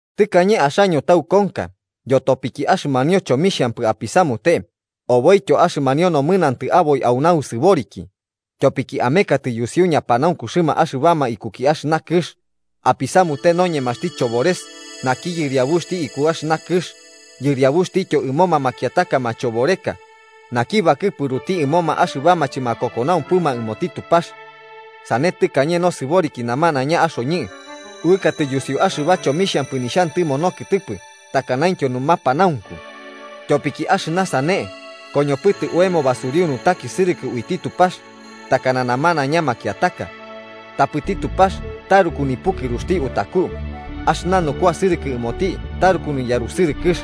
Tɨkañe axaño taukonka yotopiki axɨmanio chomixhampɨ apisamute oboityo axɨmanio nomɨnantɨ aboi au nausɨboriki, tyopiki amekatɨ yusiu ñapanaunkuxɨma axɨbama ikuki axɨna kɨx, apisamute noñemaxti Chobores naki yɨriabuxti iku axɨna kɨx yɨriabuxtityo ɨmoma makiataka machoboreka naki bakɨpuruti ɨmoma axɨbama chɨmakokonaumpɨma ɨmoti Tupax. Sane tɨkañe nosɨboriki namanaiña axoñɨ, uɨkatɨ yusiu axɨba chomixhampɨ nixhantɨmo nokɨtɨpɨ takanaintyo numapanaunku. Tyopiki axɨna sane, koñopɨtɨ oemo basuriu nutakisɨrɨkɨ uiti Tupax, takana namanaiña makiataka. Tapɨti Tupax taruku nipukɨruxti utaku, axɨna nukuasɨrɨkɨ ɨmoti taruku niyarusɨrɨkɨx,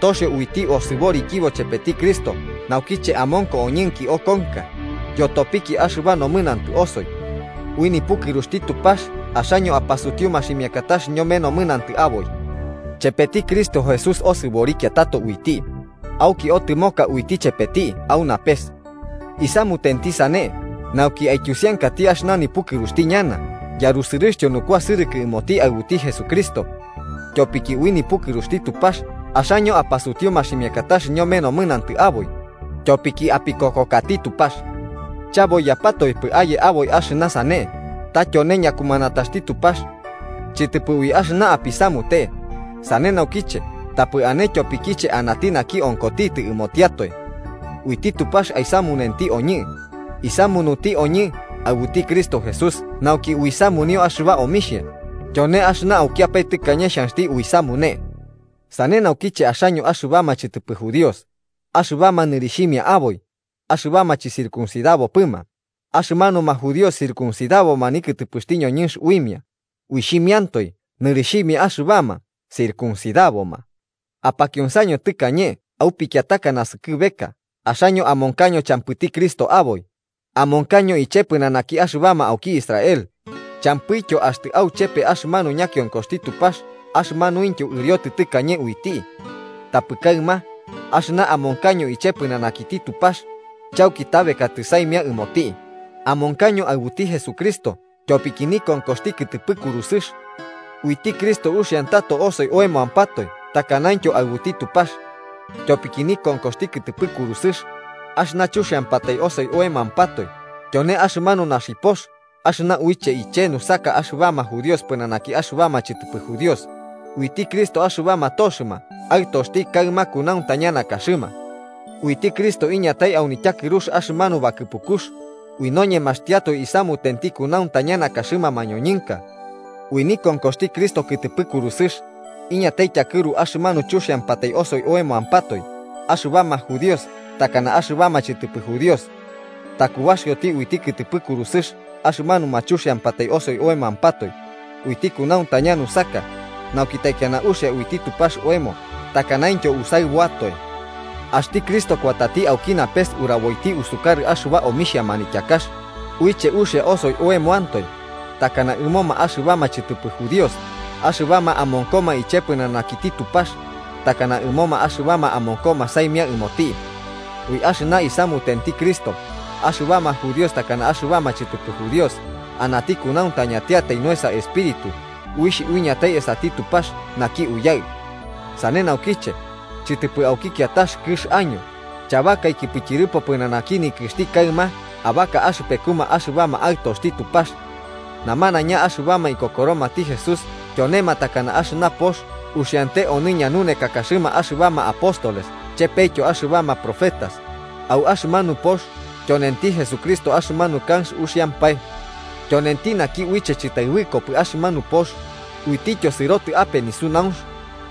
toxio uiti osɨborikibo chepeti Cristo naukiche amonko oñɨnki okonka yotopiki axɨba nomɨnantɨ osoi. Ui nipukɨruxti Tupax axaño apasutiu maximiakatax ñome nomɨnantɨ aboi. Chepeti Cristo Jesús osɨborikia tato uiti, auki otɨmoka uiti chepeti au napes. Isamutenti sane nauki aityusiankati axɨna nipukɨruxti ñana yarusɨrɨxtyo nukuasɨrɨkɨ ɨmoti aɨbuti Jesucristo. Tyopiki ui nipukɨruxti Tupax axaño apasutiu maximiakatax ñome nomɨnantɨ aboi tyopiki apikokokati Tupax. Chaboiyapatoepɨ aye aboi axɨna sane, ta tyone ñakumanataxti Tupax. Chɨtɨpɨ ui axɨna apisamute, sane naukiche tapɨ ane tyopikiche anati naki onkotitɨ ɨmotiatoe. Uiti Tupax aisamunuti oñɨ. Isamunuti oñɨ aɨbuti Cristo Jesús nauki uisamunio axɨba omixhia, tyone axɨna aukiapae tɨkañe xhanxti uisamune. Sane naukiche axaño axɨbama chɨtɨpɨ judíos, axɨbama nɨrixhimia aboi “axɨbama chɨcircuncidabopɨma” axɨmanuma judíos circuncidabo nikɨtɨpɨxti ñoñɨnx uimia, uixhimiantoe nɨrixhimia axɨbama “circuncidaboma”, apakionsaño tɨkañe au pikiataka naskɨbeka axaño amonkaño champɨti Cristo aboi, amonkaño iche pɨnanaki axɨbama auki Israel, champɨityo axtɨ auchepe axɨmanu ñakionkoxti Tupax axɨmanuintyo ɨriotɨ tɨkañe uiti. Tapɨ kaɨma, axɨna amonkaño iche pɨnanakiti Tupax, chauki tabekatɨ saimia ɨmoti, amonkaño aɨbuti Jesucristo tyopiki nikonkoxti kɨtɨpɨ kurusɨx. Uiti Cristo uxiantato osoi oemoampatoe takanaintyo aɨbuti Tupax. Tyopiki nikonkoxti kɨtɨpɨ kurusɨx, axɨna chuxiampatai osoi oemampatoe tyone axɨmanu naxipox axɨna uiche iche nusaka axɨbama judíos pɨnanaki axɨbama chɨtɨpɨ judíos, uiti Cristo axɨbama toxɨma aɨtoxti kaɨma kunauntaña nakaxɨma. Uiti Cristo iñatai au nityakɨrux axɨmanu bakɨpukux, ui noñemaxtiatoe isamutenti kunauntaña nakaxɨma mañoñɨnka. Ui nikonkoxti Cristo kɨtɨpɨ kurusɨx, iñatai tyakɨru axɨmanu chuxiampatai osoi oemoampatoe axɨbama judíos takana axɨbama chɨtɨpɨ judíos. Takubaxio uiti kɨtɨpɨ kurusɨx axɨmanu chuxiampatai osoi oemoampatoe, uiti kunauntaña nusaka nauki taikiana uxia uiti Tupax oemo takanaintyo usaɨbuatoe. Axti Cristo kuatati auki napes uraboiti usukarɨ axɨba omixhia manityakax uiche uxia osoi oemantoe, takana ɨmoma axɨbama chɨtɨpɨ judíos axɨbama amonkoma iche pɨnanakiti Tupax, takana ɨmoma axɨbama amonkoma saimia ɨmoti. Ui axɨna isamutenti Cristo, axɨbama judíos takana axɨbama chɨtɨpɨ judíos anati kunauntañantiatai nuesa Espíritu uixh uiñatai esati Tupax naki Uyaɨ. Sane naukiche, chɨtɨpɨ auki kiatax kɨx año, chabakaikipɨ tyɨrɨpo pɨnanaki nikɨxti kaɨma abaka axɨpekuma axɨbama aɨtoxti Tupax. Namanaiña axɨbama ikokoromati Jesús tyonema takana axɨna pox uxiante onɨ ñanunekakaxɨma axɨbama apóstoles chepetyo axɨbama profetas, au axɨmanu pox tyonenti Jesucristo axɨmanu kanx uxiampae. Tyonenti naki uiche chɨtaɨbɨkopɨ axɨmanu pox uitityo sɨrotɨ ape nisunaunx,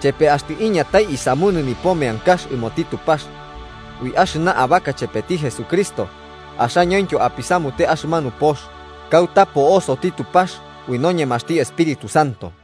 chepe axtɨ iñatai aisamunɨ nipo meankax ɨmoti Tupax. Ui axɨna abaka chepeti Jesucristo, axañointyo apisamute axɨmanu pox, kauta po'osoti Tupax ui noñemaxti Espíritu Santo.